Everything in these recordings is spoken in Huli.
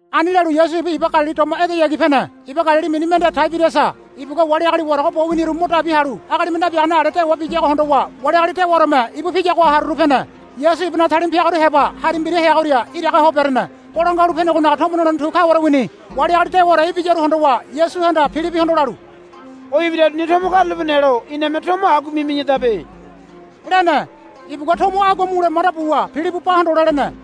Ani lalu Yasu ibu iba Galili doma edeyagi pene. Iba Galili mini mende Taiberiasa. Ibugua wali agali warago bo winiru mo dabi halu agalime nabiagane ale dewa biyago hondowa wali agali dewaoreme ibu piyagoha haruru pene. Yasu ibunaga talima piagaru heba hari mbira heagoria iraga ho berene. Bolangua Halu Penegonaga tomo nolene tu kaware wini. Wali agali dewaore ibiyaru hondowa Yasuhanda Pilibihondo lalu, O ibiraruni tomo karulape nelo iname tomo agua mimi̱yadabe, lene. Ibugua tomo agua mule manda buwa Pilibi ba hondole lene.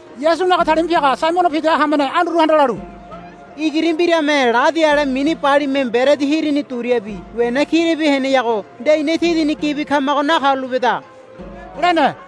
Yasunaga talima piaga Saimono Pida hamene Anduruhanda lalu, Igiri mbirame ladi ale mini balime mberedi hirini duriabi wena kirabi heneago nde ina tidini gibi kamago nakarulapeda, lene.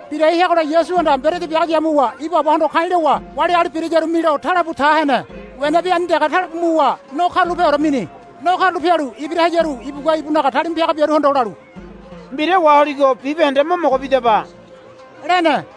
Birai heagola Yasuhanda mberedi biago yamuwa ibu Abahondo ka̱i̱ lowa wali agali birayaru milo talebu tahene. Wenabi ani dege talebu muwa no karulapeore mini. No karula pialu ibira hayaru ibugua ibunaga talima piaga biaruhondo lalu, Mbira waholigo bibahende mo mogo bidaba, lene.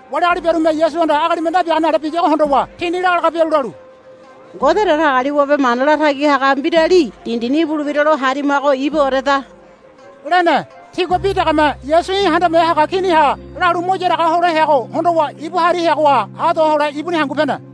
Wali agali biarume Yasuhanda agalime nabiagane ale biyago hondowa tini laga laga bialu lalu, Ngode Datagaliwabe Mana Latagi Haga Mbirali dindini ibulebira lo harimago ibuoreda, lene. Tigua bi degeme, Yasu í̠ handame haga kini ha, lalu ibu mo yaraga hole heago hondowa ibu hari heagoha ha do hole ibuni hangu pene.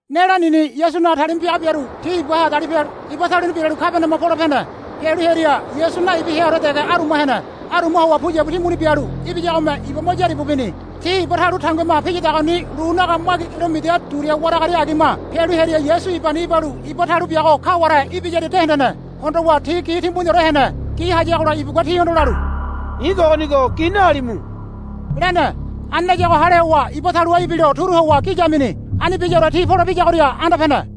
Ne̱ lanini Yasunaga talima piaga biaru ti ibaha dalipe halu iba taluni biralu Kabaniama pole pene. Pialu hearia Yasu naibi heaore dege aruma hene. Aruma howa puyabu timbuni pulalu ibiyagome iba mo yaribu bini. Ti iba talu tanguima piyadagoni lunaga magi kilomida duria waragaria agima pialu hearia Yasu ibani ibalu iba talu biago kaware ibiyaria de hendene. Hondowa ti gi timbuniore hene. Gi hayagola ibugua tihondo lalu, I̱ kogonigo gi nahalimu, lene. Ani layago hale howa iba taluha ibilo turu howa gi yamini. Ani biyaore ti polebiyagoria anda pene.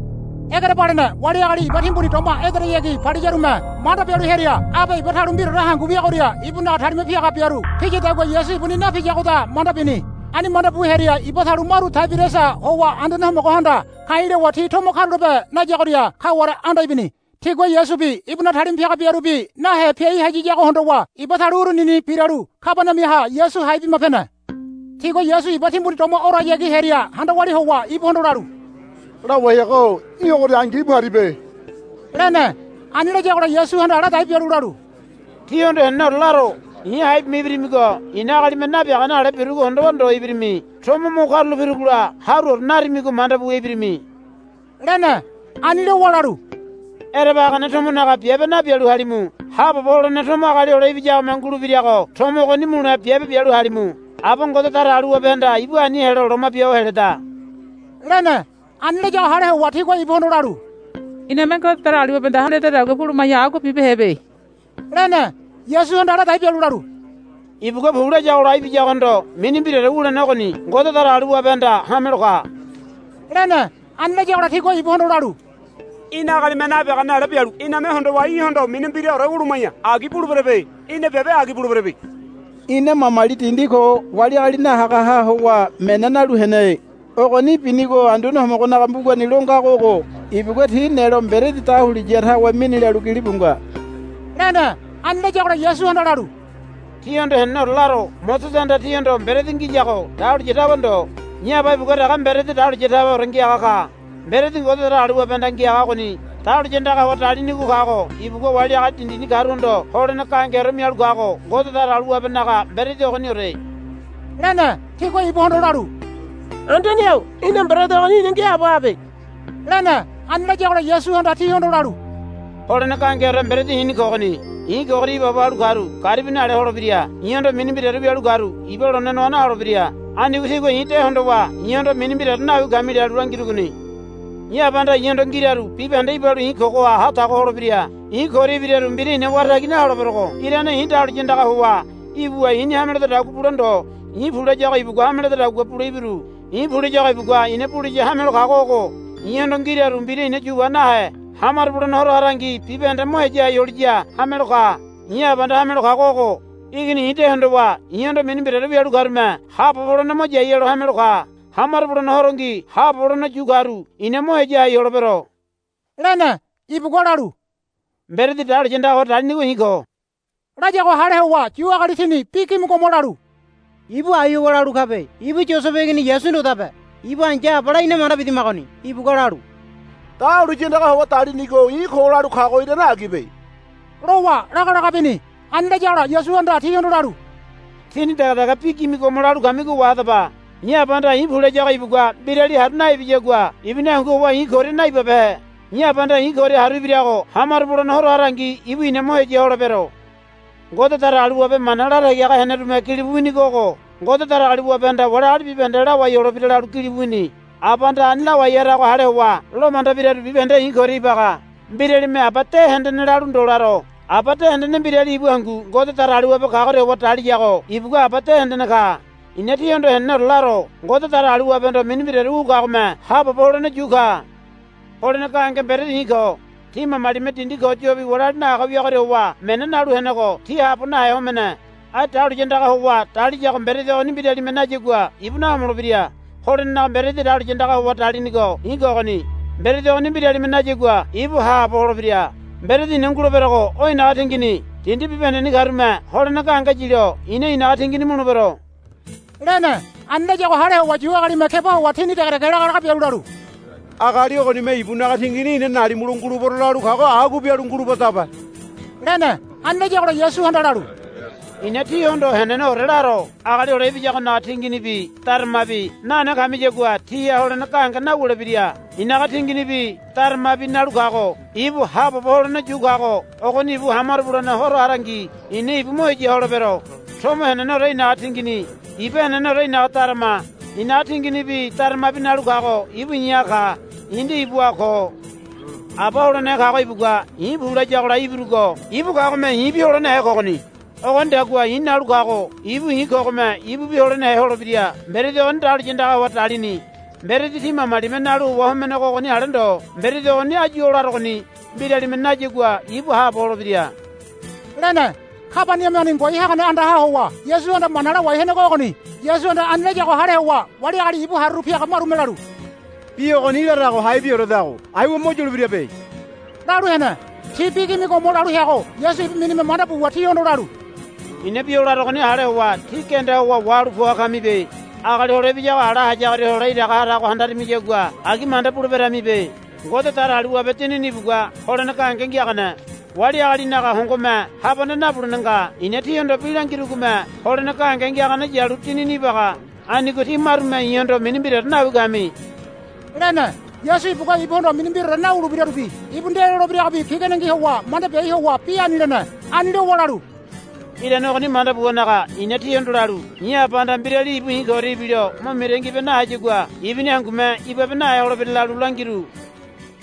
Egerebalene wali agali iba timbuni doma edeyagi paliyarume manda bialu hearia, Abe iba talu mbiraore hangu wiyagoria ibunaga talima piaga biaru piyadagua Yasu ibuni napiyagoda, manda bini. Ani manda bu hearia iba talu maru Taiberiasa howa Anduane Homogohanda ka̱i̱ lowa ti tomo karulape nayagoria kaware anda ibini. Tigua Yasubi ibunaga talima piaga biarubi nahe piai hayiyago hondowa iba talu urunini biralu Kabaniamaha Yasu hai bima pene. Tigua Yasu iba timbuni doma orayagi hearia handa walia howa ibuhondo lalu, Lawai haga-o í̠ ogoria angi íbu haribe, lene. Ani layagola Yasuhanda ladai bialu lalu, Tíhondo heneneore laro. I̱ hai bima ibirimigo i̱na agalime nabiagane ale birugo hondowa ndo ibirimi. Tomo mo karula pirugola haruore narimigo manda buwa ibirimi, lene. Ani lowa lalu, Ereba hagane tomonaga biabe nabialu halimu. Haabobo holene tomo Agali Hole Ibiyagome ngulebirago tomo ogoni mule biabe bialu halimu. Aba Ngode Datagaliwabehanda ibu ani helo loma bia ho heleda, lene. Ani layago hale howa tigua ibuhondo lalu, Iname Ngode Datagaliwabehanda hame ledadagua buluma̱ya agua bibehebe, lene. Yasuhanda ladai bialu lalu, Ibugua pu layagola ibiyagohondo mini mbiraore wulene ogoni Ngode Datagaliwabehanda hamelo ka, lene. Ani layagola tigua ibuhondo lalu, Í̠na agalime nabiagane ale bialu iname hondowa í̠hondo mini mbiraore wuluma̱ya agi buleberebe. Í̠na biabe agi buleberebe. Ina mamali dindi ko wali agali nahagaha howa mena nalu hene. Ogoni binigo Anduane Homogonaga mbugani lo ngago ogo, Ibugua ti nelo mberedi dahuliya tawe mini, lalu gilibu nga, lene. Ani layagola Yasuhanda lalu, Tíhondo heneneore laro. Mosesehanda tíhondo mberedi ngiyago dahuliya tawe ndo. I̱ Aba ibugua dege mberedi dahuliya taweore ngiaga ka. Mberedi Ngode Datagaliwabehanda ngiaga ogoni dahuliya andaga howa dalinigo kago ibugua wali agali dindini karuhondo holene gahengeore mialu kago Ngode Datagaliwabenaga mberedi ogoniore, lene. Tigua ibuhondo lalu, Anduane-o í̠na mberedi ogoni ina ngiaabo habe, lene. Ani layagola Yasuhanda tihondo lalu, Holene gahengeore mberedi i̱ni kogoni. I̱ koria ibaabo halu karu garibi nale holebira. I̱hondo mini mbiraore wialu karu iba lone noa naholebira. Anigo tígua i̱ de hondowa i̱hondo mini mbiraore nawi kami lalu langirugoni. I̱ Abahanda i̱hondo ngiraru bibahende ibalu i̱ kogo haho tago holebira. I̱ koria ibiraru mbira i̱na wara tagi naholeberogo irane i̱ dahuliya andaga howa ibuwa i̱ni hame ledodagua bule ndo. I̱ pu layago ibugua hame ledadagua bule ibiru. I̱ pu layago ibugua i̱na buliya hamelo kago ogo. I̱hondo ngiraru mbira i̱na yu wa nahe hamaro bulene horo harangi bibahende mo heya hai holiya hamelo ka. I̱ Abahanda hamelo kago ogo. Igini i̱ de hondowa i̱hondo mini mbiraore wialu karume haabobo holene mo yai helo hamelo ka. Hamaro bulene horongi haabobo holene yu karu i̱na mo heya hai holebero, lene. Ibugua lalu, Mberedi dahuliya andaga howa dalinigo i̱ ko, layago hale howa Yu agali tini bi gimigomo lalu, Ibu ai howa lalu kabe. Ibu Yosebe igini Yasu ndodabe. Ibu ai̱ya abala ina manda bidamagoni. Ibugua lalu, Dahuliya andaga howa dalinigo i̱ ko, lalu kago irane agibe, lowa laga laga bini. Ani layagola Yasuhanda tihondo lalu, Tíni dege dege bi gimigomo lalu kamigo wahadaba. I̱ Abahanda i̱ pu layago ibugua mbirali haru naibiyagua ibuni hangu howa i̱ koria naibabehe. I̱ Abahanda i̱ koria haru ibirago hamaro bulene horo harangi ibu i̱na mo heya holebero. Ngode Datagaliwabe mana latagi haga henerume gilibu winigo ogo, Ngode Datagaliwabehanda wali agali bibahende lawai holebira, lalu gilibu wini. Abahanda ani lawai harago hale howa lomanda biraru bibahende i̱ koria ibaga. Mbiralime Aba de hendene lalu ndo laro. Aba de hendene mbirali ibu hangu Ngode Datagaliwabe kagoria howa daliyago ibugua Aba de hendene ka. I̱na tíhondo heneneore laro. Ngode Datagaliwabehondo mini mbiraore wu kagome haabobo holene yu ka. Holene gahenge mberedi i̱ ko. Tí mamalime dindi ko yobi wali agali nahaga wiagoria howa mena nalu henego ti haabo nahe homene. Ai dahuliya andaga howa daliyago mberedi ogoni mbiralime nayagua ibu nahomolebira. Holenenaga mberedi dahuliya andaga howa dalinigo i̱ kogoni. Mberedi ogoni mbiralime nayagua ibu haabo holebira. Mberedi i̱na nguleberogo o i̱naga tingini. Dindi bibahendeni karume holene gahenge yilo i̱na i̱naga tingini mulebero, lene. Ani layago hale howa Yu agalime keba howa tini dege dege laga laga bialu lalu, Agali ogonime ibunaga tingini ina nalimulo ngulebero lalu kago agua bialu ngulubadabe, lene. Ani layagola Yasuhanda lalu, I̱na tíhondo heneneore laro. Agali Hole Ibiyagonaga tinginibi daramabi nane kamiyagua tíha holene gahenge nawulebira. I̱naga tinginibi daramabi nalu kago ibu haabobo holene yu kago ogoni ibu hamaro bulene horo harangi i̱na ibu mo heya holebero. Tomo heneneore i̱naga tingini. Iba heneneore i̱naga darama. I̱naga tinginibi daramabi nalu kago ibu i̱ha ka. I̱ nde ibuha ko. Aba holenehe kago ibugua i̱ pu layagola ibirugo ibu kagome i̱bi holenehe kogoni. Ogonidagua i̱ nalu kago ibu i̱ kogome ibubi holenehe holebira. Mberedi ogoni dahuliya andaga howa dalini. Mberedi tí mamalime nalu howa homenego ogoni ale ndo. Mberedi ogoni áyu o larogoni mbiralime nayagua ibu haabo holebira, lene. Kabaniamani ngoai hagane andaha howa Yasuhanda mana lawai henego ogoni. Yasuhanda ani layago hale howa wali agali ibu haruru piaga marume lalu, Bi ogoni larago haibioredago aiwa mo yulebirabe, lalu hene. Ti bi gimigomo lalu heago Yasu ibu minime manda buwa tihondo lalu, I̱na bi o larugoni hale howa tí genda howa wahalu poa kamibe. Agali Hole Ibiyago ala hayagoria hole iraga harago handarimiyagua agi manda buleberamibe. Ngode Datagaliwabe Dinini ibugua holene gahenge ngiagane. Wali agalinaga hongome habane nabulene nga. I̱na tíhondo bi langirugome holene gahenge ngiagane yalu Dinini ibaga. Anigo tí marume i̱hondo mini mbiraore nawi kami, lene. Yasu ibugua ibuhondo mini mbiraore nawulebirarubi ibu nde lolebiragobi piganengi howa manda biai ho howa bi ani lene. Ani lowa lalu, Irane ogoni manda buwanaga i̱na tíhondo lalu i̱ Abahanda mbirali ibu i̱ koria ibilo mo mitangi bia nahayagua ibuni hangume ibabe nahe holebira lalu langiru,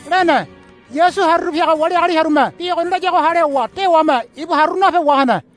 lene. Yasu haruru piaga wali agali hearume bi ogoni layago hale howa dewame ibu haruru nape wahene.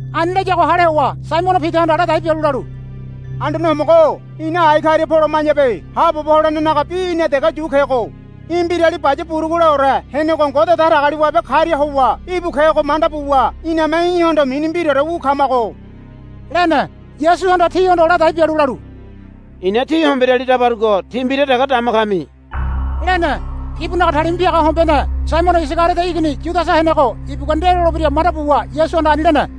Ani layago hale howa Saimono Pidahanda ladai bialu lalu, Anduane Homogo-o ina ai karia poloma̱yabe. Haabobo holenenaga bi í̠na dege yu kego. Í̠ Mbirali Baya Buruguleore henego Ngode Datagaliwabe karia howa íbu kego manda buwa iname í̠hondo mini mbiraore wu kamago, lene. Yasuhanda tihondo ladai bialu lalu, I̱na tí homberiali dabarugo tí mbira dege dama kami, lene. Ibunaga talima piaga hombeane Saimono Isagariodo igini Yudasa henego ibugua nde lolebira manda buwa Yasuhanda ani lene.